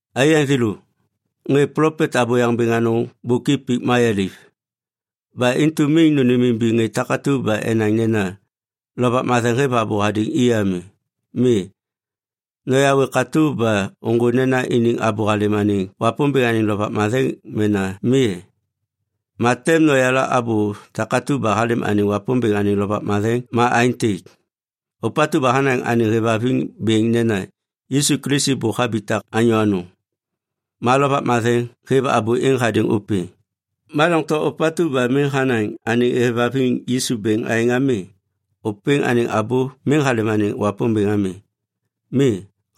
Aiyaŋ thêlô, ŋê plopet abôyaŋ bêŋ anôŋ bôk i pik mayaliv. Ba intu miŋ nônêmimbiŋ ŋê takatu ba enaŋ nena Lovak Matheŋ hêv abô hadêŋ i ami. Mi, noyawê katô ba ôŋgô nena iniŋ abô halêm anêŋ Wapômbêŋ anêŋ Lovak Matheŋ mena mi e? Ma tem noyala abô takatu ba halêm anêŋ Wapômbêŋ anêŋ Lovak Matheŋ ma aêntêk. Ôpatu ba hanaŋ anêŋ hêvhaviŋ bêŋ nena, “Yisu Kilisi bôk habitak anyô anôŋ” ma Lovak Matheŋ hêv abô êŋ hadêŋ ôpêŋ. Ma doŋtom ôpatu ba miŋ hanaŋ anêŋ hêvhaviŋ Yisu bêŋ aêŋ ami, ôpêŋ anêŋ abô miŋ halêm anêŋ Wapômbêŋ ami. Mi,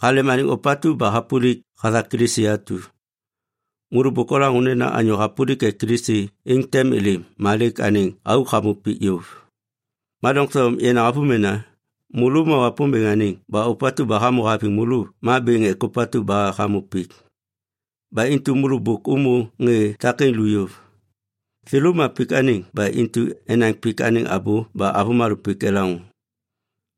halêm anêŋ ôpatu ba hapôlik hathak Kilisi atu. Môlô bôk olaŋô nena anyô hapôlik ek Kilisi êŋ tem êlêm ma lêk anêŋ auk hamô pik yôv. Ma doŋtom yenaŋ avômena, môlô ma Wapômbêŋ anêŋ ba ôpatu ba hamô haviŋ môlô ma bêŋ ek ôpatu ba hamô pik. Ba intu môlô bôk ômô ŋê takêŋ lu yôv. Thêlô ma pik anêŋ ba intu enaŋ pik anêŋ abô ba avômalô pik elaŋô.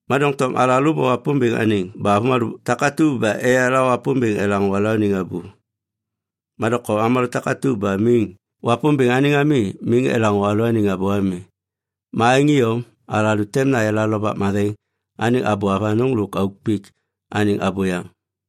Ma doŋtom alalô ma Wapômbêŋ anêŋ ba avômalô takatu ba eyala Wapômbêŋ elaŋô alalôaniŋ abô. Ma doŋtom avômalô takatu ba miŋ Wapômbêŋ anêŋ ami miŋ elaŋô alalôaniŋ abô ami. Ma aêŋ iyom, alalô tem nayala Lovak Matheŋ anêŋ abô avanôŋ lôk auk pik anêŋ abôyaŋ.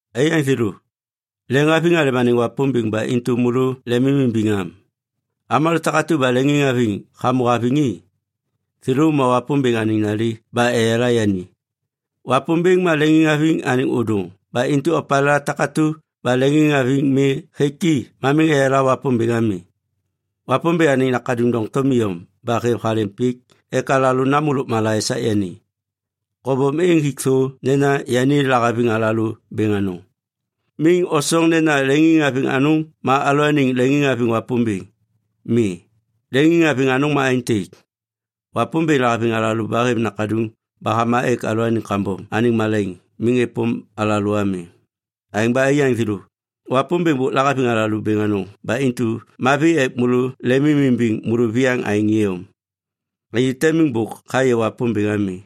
Aiyaŋ thêlô, leŋhaviŋ halêm anêŋ Wapômbêŋ ba intu môlô lemimimbiŋ am. Avômalô takatu ba leŋiŋhaviŋ hamô haviŋ i, thêlô ma Wapômbêŋ anêŋ nali ba eyala yani. Wapômbêŋ ma leŋiŋhaviŋ anêŋ ôdôŋ ba intu opalêla takatu ba leŋiŋhaviŋ mi hêk i ma miŋ eyala Wapômbêŋ ami. Wapômbêŋ anêŋ Nakaduŋ doŋtom iyom ba hêv halêm pik ek alalô namô lôkmala esak yani. Kobom êŋ hik thô nena yani lahaviŋ alalô bêŋ anôŋ. Miŋ osoŋ nena leŋiŋhaviŋ anôŋ ma alalôaniŋ leŋiŋhaviŋ Wapômbêŋ. Mi, leŋiŋhaviŋ anôŋ ma aêntêk. Wapômbêŋ lahaviŋ alalô ba hêv Nakaduŋ ba hama ek alalôaniŋ kambom anêŋ malaiŋ miŋ êpôm alalô ami. Aêŋ ba aiyaŋ thêlô, Wapômbêŋ bôk lahaviŋ alalô bêŋ anôŋ ba intu mavi ek môlô lemimimbiŋ môlôviyaŋ aêŋ iyom. Anyô te miŋ bôk hayê Wapômbêŋ ami.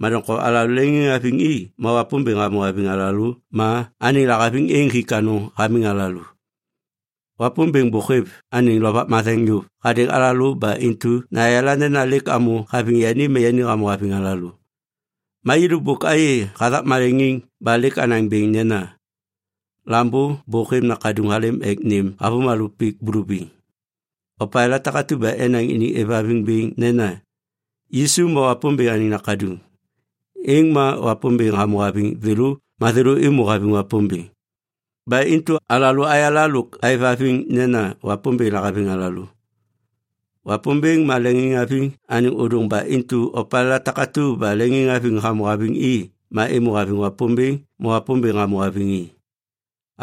Ma doŋtom alalô leŋiŋhaviŋ i ma Wapômbêŋ hamô haviŋ alalô ma anêŋ lahaviŋ êŋ hik anôŋ hamiŋ alalô. Wapômbêŋ bôk hêv anêŋ Lovak Matheŋ yôv hadêŋ alalô ba intu nayala nena lêk amô haviŋ yani ma yani hamô haviŋ alalô. Ma yêlô bôk ayê hathak maleŋiŋ ba lêk anaŋ bêŋ nena Lambô bôk hêv Nakaduŋ halêm ek nêm avômalô pik bulubiŋ. Opalêla takatu ba enaŋ iniŋ êvhaviŋ bêŋ nena, “Yisu ma Wapômbêŋ anêŋ Nakaduŋ”, êŋ ma Wapômbêŋ hamô haviŋ thêlô ma thêlô êmô haviŋ Wapômbêŋ. Ba intu alalô ayala lôk aêvhaviŋ nena Wapômbêŋ lahaviŋ alalô. Wapômbêŋ ma leŋiŋhaviŋ anêŋ ôdôŋ ba intu opalêla takatu ba leŋiŋhaviŋ hamô haviŋ i ma êmô haviŋ Wapômbêŋ ma Wapômbêŋ hamô haviŋ i.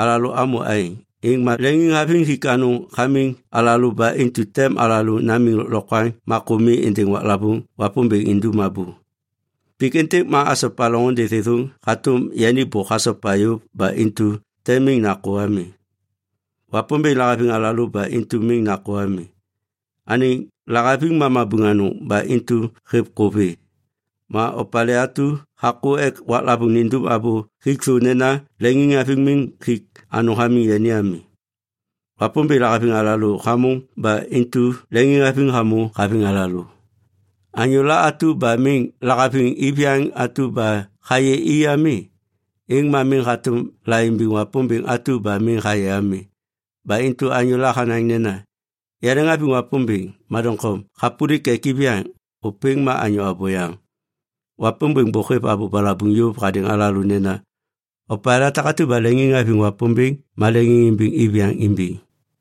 Alalô amô aêŋ, êŋ ma leŋiŋhaviŋ hik anôŋ hamiŋ alalô ba intu tem alalô namiŋ lôklokwaŋ ma kô mi êndêŋ waklavôŋ Wapômbêŋ indum abô. Pik êntêk ma asopa loŋôndê thêthôŋ hatôm yani bôk hasopa yôv ba intu tem miŋ nakô ami. Wapômbêŋ lahaviŋ alalô ba intu miŋ nakô ami. Anêŋ lahaviŋ ma mabuŋ anôŋ ba intu hêv kô vê. Ma opalê atu hakô ek waklavôŋ nindum abô hik thô nena leŋiŋhaviŋ miŋ hik anôŋ hamiŋ yani ami. Wapômbêŋ lahaviŋ alalô hamôŋ ba intu leŋiŋhaviŋ hamô haviŋ alalô. Anyôla atu ba miŋ lahaviŋ iviyaŋ atu ba hayê i ami, êŋ ma miŋ hatôm laimbiŋ Wapômbêŋ atu ba miŋ hayê ami. Ba intu anyôla hanaŋ nena, “Yaleŋhaviŋ Wapômbêŋ” ma doŋtom hapôlik ek iviyaŋ, ôpêŋ ma anyô abôyaŋ. Wapômbêŋ bôk hêv abô balabuŋ yôv hadêŋ alalô nena, “Opalêla takatu ba leŋiŋhaviŋ Wapômbêŋ ma leŋiŋimbiŋ iviyaŋ imbiŋ.”